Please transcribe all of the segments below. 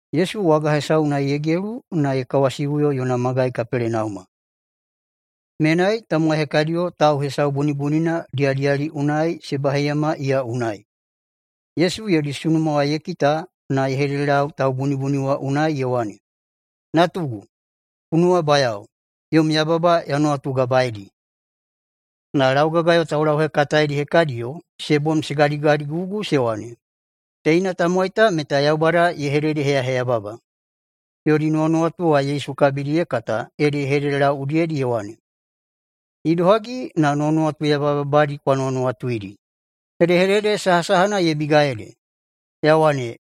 Yesu waga hesau unai ye gelu na ye kawasiꞌuyo yona magai Kapelenauma. Menai tamowai hekadiyo tau hesau bunibunina diyadiyali unai se baheiyama iya unai. Yesu yodi sunuma ye kita na ye hededelau taubunibuni wa unai ye wane, “Natugu! Ku nuwabayao, yom yababa ya nuwatugabaeidi.” Na laugagayo taulauhekataedi hekadiyo se bom se gadigadigugu se wane, “Teina tamowai ta meta Yaubada ye hededeheyaheyababa.” Yodi nuwanuwatu wa Yesu kabidi ye kata ede ye hededelau udiyedi ye wane, “Idohagi na nuwanuwatu yababadi kwa nuwanuwatuidi. Hedehedede sahasahana ye biga ede, ya wane,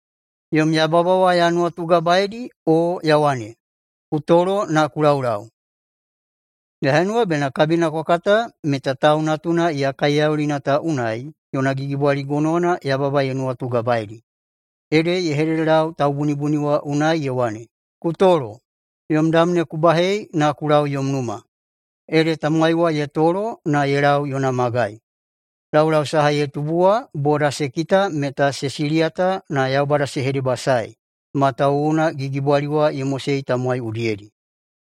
‘Yom yababa wa ya nuwatugabaeidi’, o, ya wane, ‘Ku tolo na ku laulau’? Ya henuwa bena kabina kwa kata meta Tau Natuna iya kaiyaulina ta unai yona gigibwali gonowana yababa ye nuwatugabaeidi.” Ede ye hededelau taubunibuni wa unai ye wane, “Ku tolo, yom dam ne ku bahei na ku lau yom numa.” Ede tamowai wa ye tolo na ye lau yona magai. Laulau saha ye tubu wa boda se kita meta se siliyata na Yaubada se hedebasaei, matawuwuna gigibwali wa ye mosei tamowai udiyedi.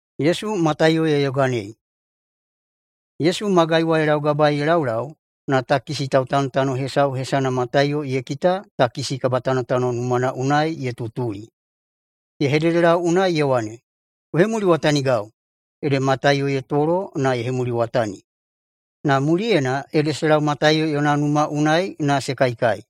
Yesu magai wa ye laugabaei ye laulau, na takisi tautanotano hesau hesana Mataiyo ye kita takisi kabatanotano numana unai ye tutuli. Ye hededelau unai ye wane, “Ku hemuliwatanigau.” Ede Mataiyo ye tolo na ye hemuliwatani. Na muliyena ede se lau Mataiyo yona numa unai na se kaikai.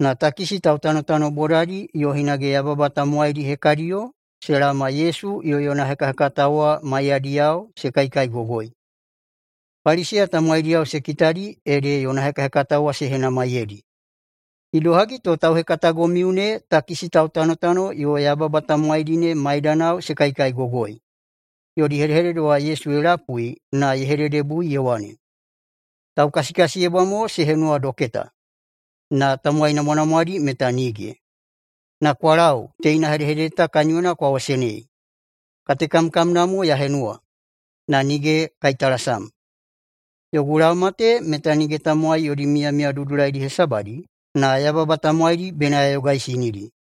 Na takisi tautanotano bodadi yo hinage yababa tamowaidi hekadiyo se laoma Yesu yo yona hekahekatao wa maiyadiyao se kaikaigogoi. Paliseya tamowaidiyao se kitadi ede yona hekahekatao wa se henamaiyeidi, “Idohagi to tauhekatagomiu ne takisi tautanotano yo yababa tamowaidi ne maidanao se kaikaigogoi?” Yodi hedehedede wa Yesu ye lapui na ye hededebui ye wane, “Taukasikasiyebwa mo se henuwa doketa, na tamowai namwanamwadi meta nige. Na kwa lau teina hedehedede ta kaniyona kwa wasenei: ‘Katekamkamna mo ya henuwa, na nige kaitalasam.’ Yogu laoma ta meta nige tamowai yodi miyamiya dudulaidi hesabadi, na yababa tamowaidi bena ya yogaisinidi.”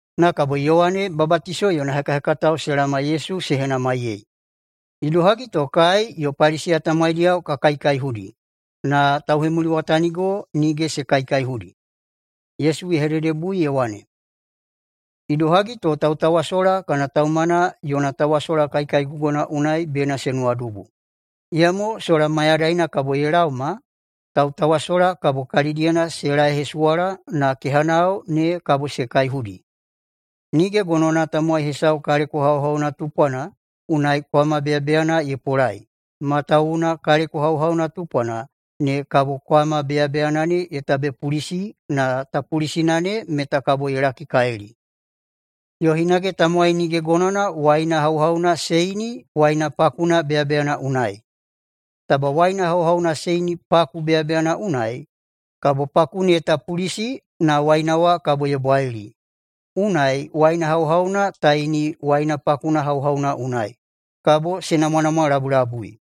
Na kabo Yowane Babatiso yona hekahekatao se laoma Yesu se henamaiyei, “Idohagi to kai yo Paliseya tamowaidiyao ka kaikaihudi, na tauhemuliwatanigo nige se kaikaihudi?” Yesu ye hededebui ye wane, “Idohagi to tautawasola kana taumana yona tawasola kaikaigogona unai bena se nuwadubu? Iyamo sola mayadaina kabo ye laoma tautawasola kabo kalidiyena se laeihesuwala na kehanao ne kabo se kaihudi. Nige gonowana tamowai hesau kaleko hauhauna tupwana unai kwama beyabeyana ye polai, matawuwuna kaleko hauhauna tupwana ne kabo kwama beyabeyana ne ye tabepulisi na tapulisina ne meta kabo ye lakikalili. Yo hinage tamowai nige gonowana waina hauhauna se ini waina pakuna beyabeyana unai. Taba waina hauhauna se ini paku beyabeyana unai, kabo paku ne ye tapulisi, na waina wa kabo ye bwalili. Unai waina hauhauna ta ini waina pakuna hauhauna unai, kabo se namwanamwalabulabui.”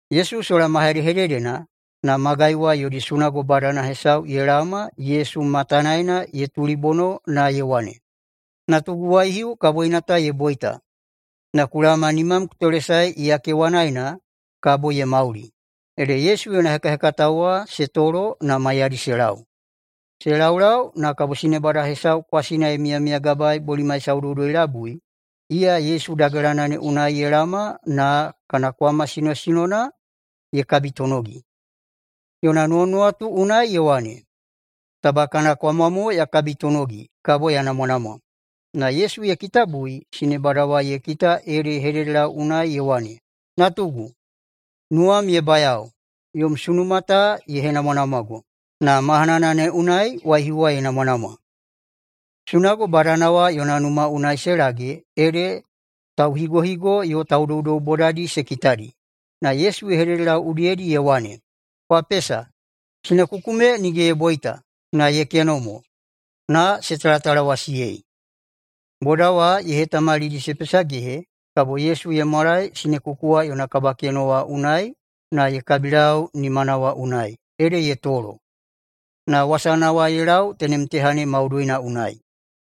Yesu sola ma hedehededena, na magai wa yodi sunago badana hesau ye laoma Yesu matanaena ye tulibono na ye wane, “Natugu waihiu kaboina ta ye boita, na ku laoma nimam ku tolesae iya kewanaena, kabo ye mauli.” Ede Yesu yo yona hekahekatao wa se tolo na maiyadi se lau. Se laulau, na kabo sinebada hesau kwasina ye miyamiyagabaei bolimai saudoudoi-labui, iya Yesu dagelana ne unai ye laoma na kana kwama sinosinona ye kabitonogi. Yona nuwanuwatu unai ye wane, “Taba kana kwama mo ya kabitonogi, kabo ya namwanamwa.” Na Yesu ye kitabui sinebada wa ye kita ede ye hededelau unai ye wane, “Natugu, nuwam ye bayao! Yom sunuma ta ye henamwanamwago.” Na mahanana ne unai waihiu wa ye namwanamwa. Sunago badana wa yona numa unai se lage ede tauhigohigo yo taudoudou bodadi se kitadi, na Yesu ye hededelau udiyedi ye wane, “Kwa pesa! Sinekuku me nige ye boita, na ye keno mo.” Na se talatalawasiyei. Boda wa ye hetamalidi se pesagehe kabo Yesu ye mwalae sinekuku wa yona kabakeno wa unai na ye kabilau nimana wa unai, ede ye tolo. Na wasana wa ye lau tenem teha ne maudoina unai.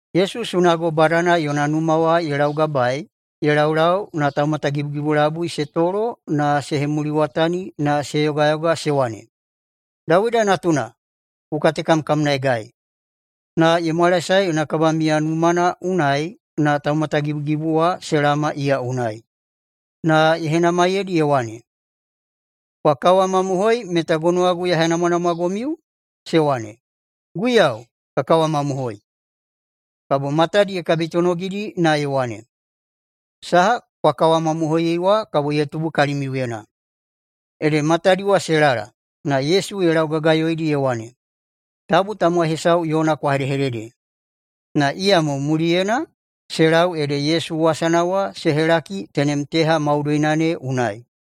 Yesu sunago badana yona numa wa ye laugabaei ye laulau na taumatagibugibu labui se tolo na se hemuliwatani na se yogayoga se wane, “Dawida natuna! Ku katekamkamnaegai!” Na ye mwalaesae yona kabamiya numana unai na taumatagibugibu wa se laoma iya unai. Na ye henamaiyeidi ye wane, “Kwa kawamamohoi meta gonowagu ya henamwanamwagomiu?” Se wane, “Guiyau, ka kawamamohoi!” Kabo matadi ye kabitonogidi na ye wane, “Saha kwa kawamamohoiyei wa kabo ye tubu kalimiuyena.” Ede matadi wa se lala. Na Yesu ye laugagayoidi ye wane, “Tabu tamowai hesau yona kwa hedehedede!” Na iyamo muliyena se lau ede Yesu wasana wa se helaki tenem teha maudoina ne unai.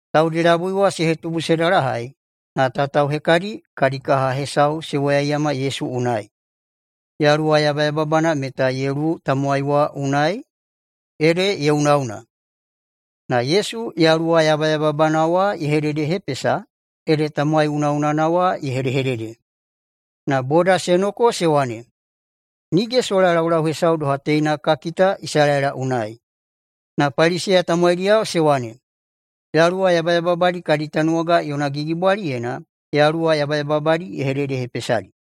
Taudi labui wa se hetubu se dalahai, na tatao hekadi kadi kaha hesau se woyaiyama Yesu unai. Yaluwa yabayababana meta ye luwu tamowai wa unai, ede ye unaꞌuna. Na Yesu yaluwa yabayababana wa ye hededehepesa, ede tamowai unaꞌunana wa ye hedehedede. Na boda se noko se wane, “Nige sola laulau hesau doha teina ka kita Isalaela unai!” Na Paliseya tamowaidiyao se wane, “Yaluwa yabayababadi kadi tanuwaga yona gigibwaliyena yaluwa yabayababadi ye hededehepesadi.”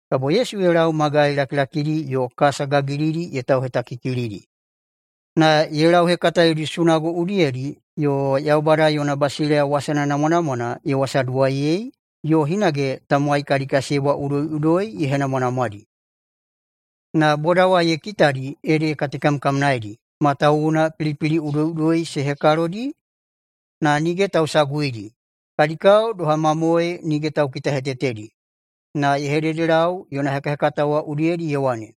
Kabo Yesu ye lau magai lakilakidi yo kasa gagilidi ye tauhetakikilidi. Na ye lauhekata yodi sunago udiyedi yo Yaubada yona basileiya wasana namwanamwana ye wasaduwaiyei, yo hinage tamowai kadi kasiyebwa udoiꞌudoi ye henamwanamwadi. Na boda wa ye kitadi ede ye katekamkamnaedi, matawuwuna pilipili udoiꞌudoi se hekalodi na nige tausaguidi, kadi kao doha mamoe nige taukitahetetedi. Na ye hededelau yona hekahekatao wa udiyedi ye wane,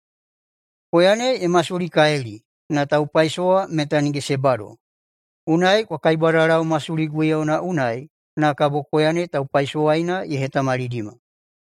“Koya ne ye masulikalili, na taupaisowa meta nige se bado. Unai kwa kaibwadalau masuli guiyauna unai na kabo koya ne taupaisowaina ye hetamalidima.”